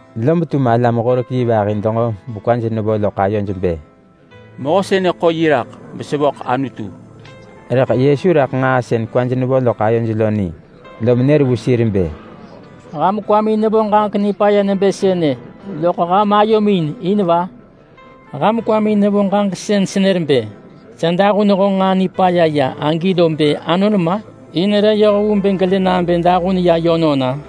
Lob tum alam-horek-yi vahi denġo bekwaj nevo loḳ ayoj bë, “Mehö sënë ḳo yi raḳ besevöḳ Anutu!” Rëḳ Yesu raḳ nġaa sën kwaj nevo loḳ ayoj lo ni, lom nër vu sir bë, “Ham kwamin nevo ġaġek nipaya nebë sënë loḳ ham ayomin in va? Ham kwamin nevo ġaġek sën senër bë, ‘Sa dahun honġ nġaa nipaya ya’ agi lo bë anon ma? In re yoh vu bë gelë nabë dahun ya yönon-a?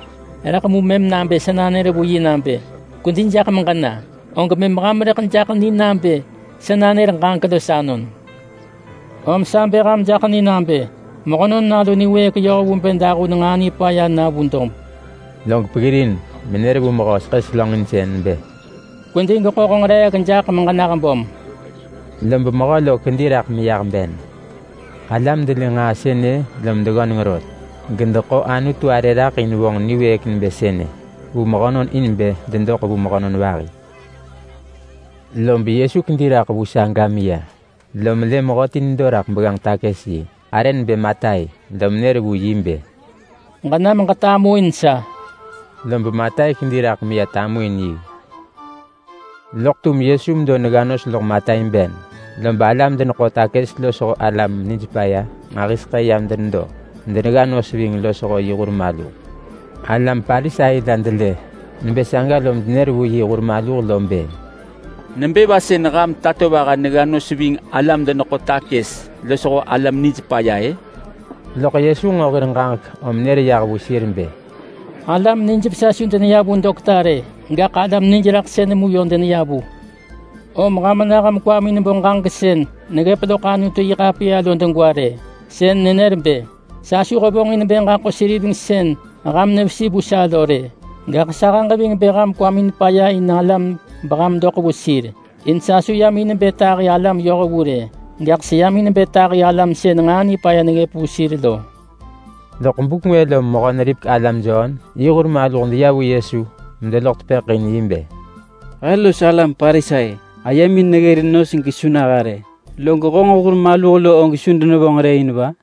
Rëḳ mu mëm nabë sa nanër vu yi nabë, ‘Kwedi jaḳ meġena’, og mëm ham rëḳ jaḳ ni nabë sa nanër ġaġek los anon. Om sa bë ham jaḳ ni nabë Mehönon Nalu niwëëk yoh vu bë dahun nġaa nipaya na vu dob—”; log peggirin menër vu mehö seḳë selönġinsën bë, “Kwedi gweḳo honġ reek jaḳ meġenah böm!” Lob mehö lo kedi raḳ meyah ben. Galam delë nġaa sënë lom deggöneng rot, gedeḳo Anutu arë raḳ in vonġ niwëëk nebë sënë vu mehönon in bë dedoḳ vu mehönon vahi. Lob Yesu kedi raḳ vu saga meya, lom lë mehöti nedo raḳ begganġ-takës-yi, arë nebë Matai. Lom nër vu yi bë, “Ġenam ġetamuin sa!” Lob Matai kedi raḳ meya tamuin yi. Loḳ tum Yesu medo negga nos loḳ Matai ben, lob alam-deneḳo-takës losho alam-nijpaya nġahiseḳë yam denedo medenegga nos ving losho yi hur maluh. Alam Parisai la delë nebë saga lom denër vu yi hur maluh bë, “Nebë va sën ham tatovaha negga nos ving alam-deneḳo-takës losho alam-nijpaya-ë?” Rëḳ Yesu nġo hir ġaġek menër yah vu sir bë, “Alam nijvesa su deneya vu dokta rë, gaḳ alam nijraḳsën mu yö deneya vu. Om ham nah bekwamin bo ġaġek sën neggëp loḳ Anutu-yi-ḳapiya lo degwa rë. Sën nenër bë: ‘Sa su hevonġin bë ġaḳo seriveng sën ham nevesi vu sa lo rë.’ Gaḳ sahëġ ving bë ham kwamin paya in alam beham doḳ vu sir. In sa su yam in bë tahi alam yohvu rë, gaḳ seyam in bë tahi alam sën nġaa nipaya neggëp vu sir lo.” Lob buk ngwë lom mehö-neripek-alam Jon yi hur maluh deya vu Yesu medeloḳ tepëḳ in yi bë, “He los alam Parisai ayemin neggërin nos buk nġahiseḳë gehe su naha rë, log honġ hur maluh og su denevonġ rë in va?”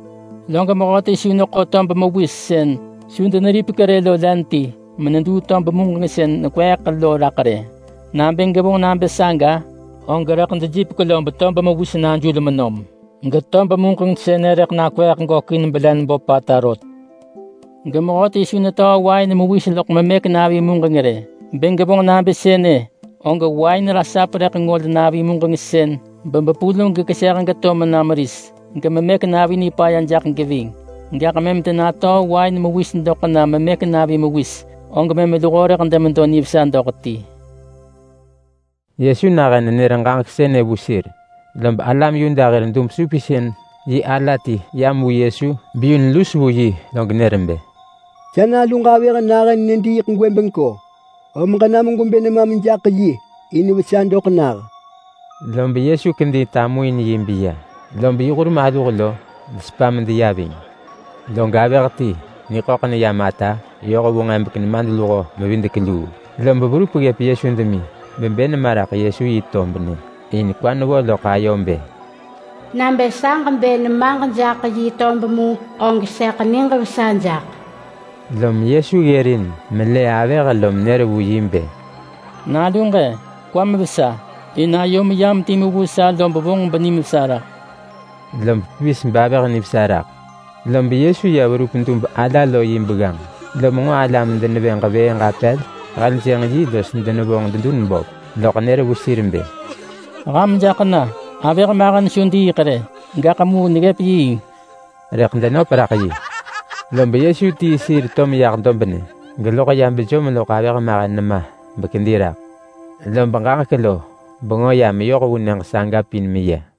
Log mehöti su neḳo tob mewis sën su deneripek rë lo len ti meneduu tob muġeng sën nekweeḳ lo raḳ rë. Nabë gevonġ nabë saga, og rëḳ dejipek lob tob mewis sënë najul menom, getob muġeng sënë rëḳ nakweeḳ gökin belen böpata rot. Gemehöti su netöö wain mewis loḳ memëk-navi muġeng rë. Bë gevonġ nabë sënë og rëḳ wain ngol navi muġeng sën bebepul gekeseh geto mena meris, gememëk-navi nipaya jaḳ geving. Gaḳ mëm denatöö wain mewis doḳ na memëk-navi mewis, og mëm luho rëḳ demedo nivesa doḳ ti.” Yesu nahën nenër ġaġek sënë vu sir, lob alam Yuda hir dub-supinsën-yi ala ti yam vu Yesu beyun lus vu yi log nër bë, “Sa naluġ avëh nahën nediiḳ gwëbengko, om ġenam gwebë nemam jaḳ yi in vesa doḳ nah.” Lob Yesu kedi tamuin yi beya, lob yi hur maluh kedi deya ving yi. Log avëh ti niḳöḳ neyam ata yoh vu nġebek nemadluho-mevidek-luu, lob verup ggëp Yesu demi bebë nema raḳ Yesu yi tob nyë. In kwa nevo ggëp ayo nebë, “Bë sa ġebë nemaġ jaḳ yi tob mu, og sëḳ niġ vesa jaḳ.” Lom Yesu ggërin melë avëh lom nër vu yi bë, “Naluġ-e, kwam vesa! In ayom yam timu vu sa lob vonġ benimvesa raḳ.” Lob pevis bavëh nivesa raḳ. Lob Yesu ya verup dub ala lo yi begganġ. Lom nġo alam denevë ġevëëġ apel heljënġ yi los denevonġ dedun böp, loḳ nër vu sir bë, “Ham jaḳ na! Avëh mahen su diiḳ rë, gaḳ mu neggëp yiing!” Rëḳ denöp raḳ yi. Lob Yesu tii sir beto deyah dobnë, geloḳ ya bejom loḳ avëh mahen nema bekedi raḳ. Lob ġaġek lo bengö ya meyoh vu nyëġ saga pin meya.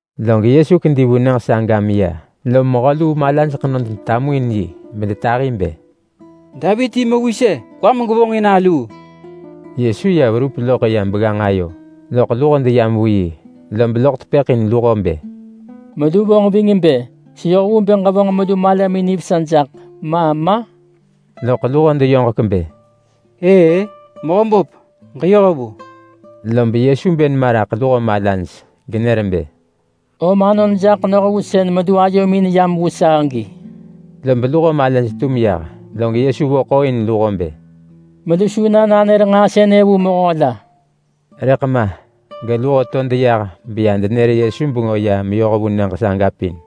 Log Yesu kedi vu nyëġ saga meya, lom mehö luu malaj ḳenod detamuin yi, bedetahi bë, “Davit yi Mewis-e! Kwam gevonġin aluu!” Yesu ya verup loḳ ya begganġ ayo, loḳ luho deyam vu yi, lob loḳ tepëḳ in luho bë, “Melu vonġ ving bë seyoh vu bë ġevonġ melu malamin nivesa jaḳ, ma ma?” Loḳ luho deyoġek bë, “Ëë-ë, Mehöböp. Ġeyoh vu.” Lob Yesu bë nema raḳ luho malaj genër bë, “Om anon jaḳ noh vu sën melu ayomin nam vu sa agi!” Lob luho malaj tum yah, log Yesu vo ḳooin luho bë, “Melu su na nanër nġaa sënë vu mehö la.” Rëḳ ma geluho to deya lob denër Yesu bengö ya meyoh vu nyëġ saga pin.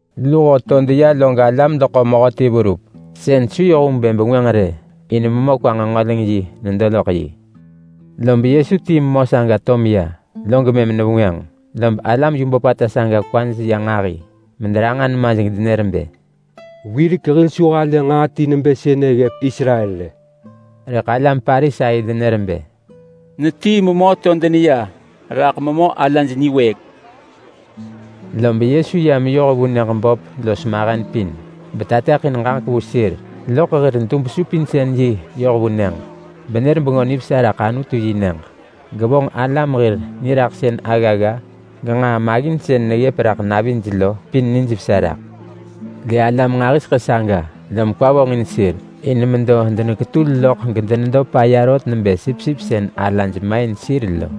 Luho to deneya log alam deḳo mehöti verup, sën su yoh vu bë bengwënġ rë in memö kwa-nġengöleng-yi nedo loḳ yi. Lob Yesu tii memö saga to meya log mëm nevengwënġ. Lob alam nġahiseḳë saga kwaj ya nġahi mederanġa nemaj gedenër bë, “Wirek hil su halë nġaa ti nebë sënë ggëp Israel rë!” Rëḳ alam Parisai denër bë, “Netii memö to deneya raḳ memö alaj niwëëk.” Lob Yesu ya meyoh vu nyëġ böp los mahen pin, betateḳin ġaġek vu sir loḳ hir dub-supinsën-yi ayo yoh vu nyëġ. Benër Bengö Nivesa raḳ Anutu-yi-nyëġ, gevonġ alam los niraḳsën aggagga genġaa maggin sën neggëp navij lo pin benijvesa raḳ. Lë alam nġahiseḳë saga, lom kwa vonġin sir. In medo deneketul loḳ gedenedo paya rot nebë sipsip sën alaj main sir lo.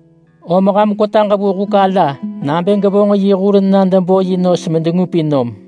Om ham kwetaġ vu huk ala nabë gevonġ yi hur na debo yi nos medengupin nom!”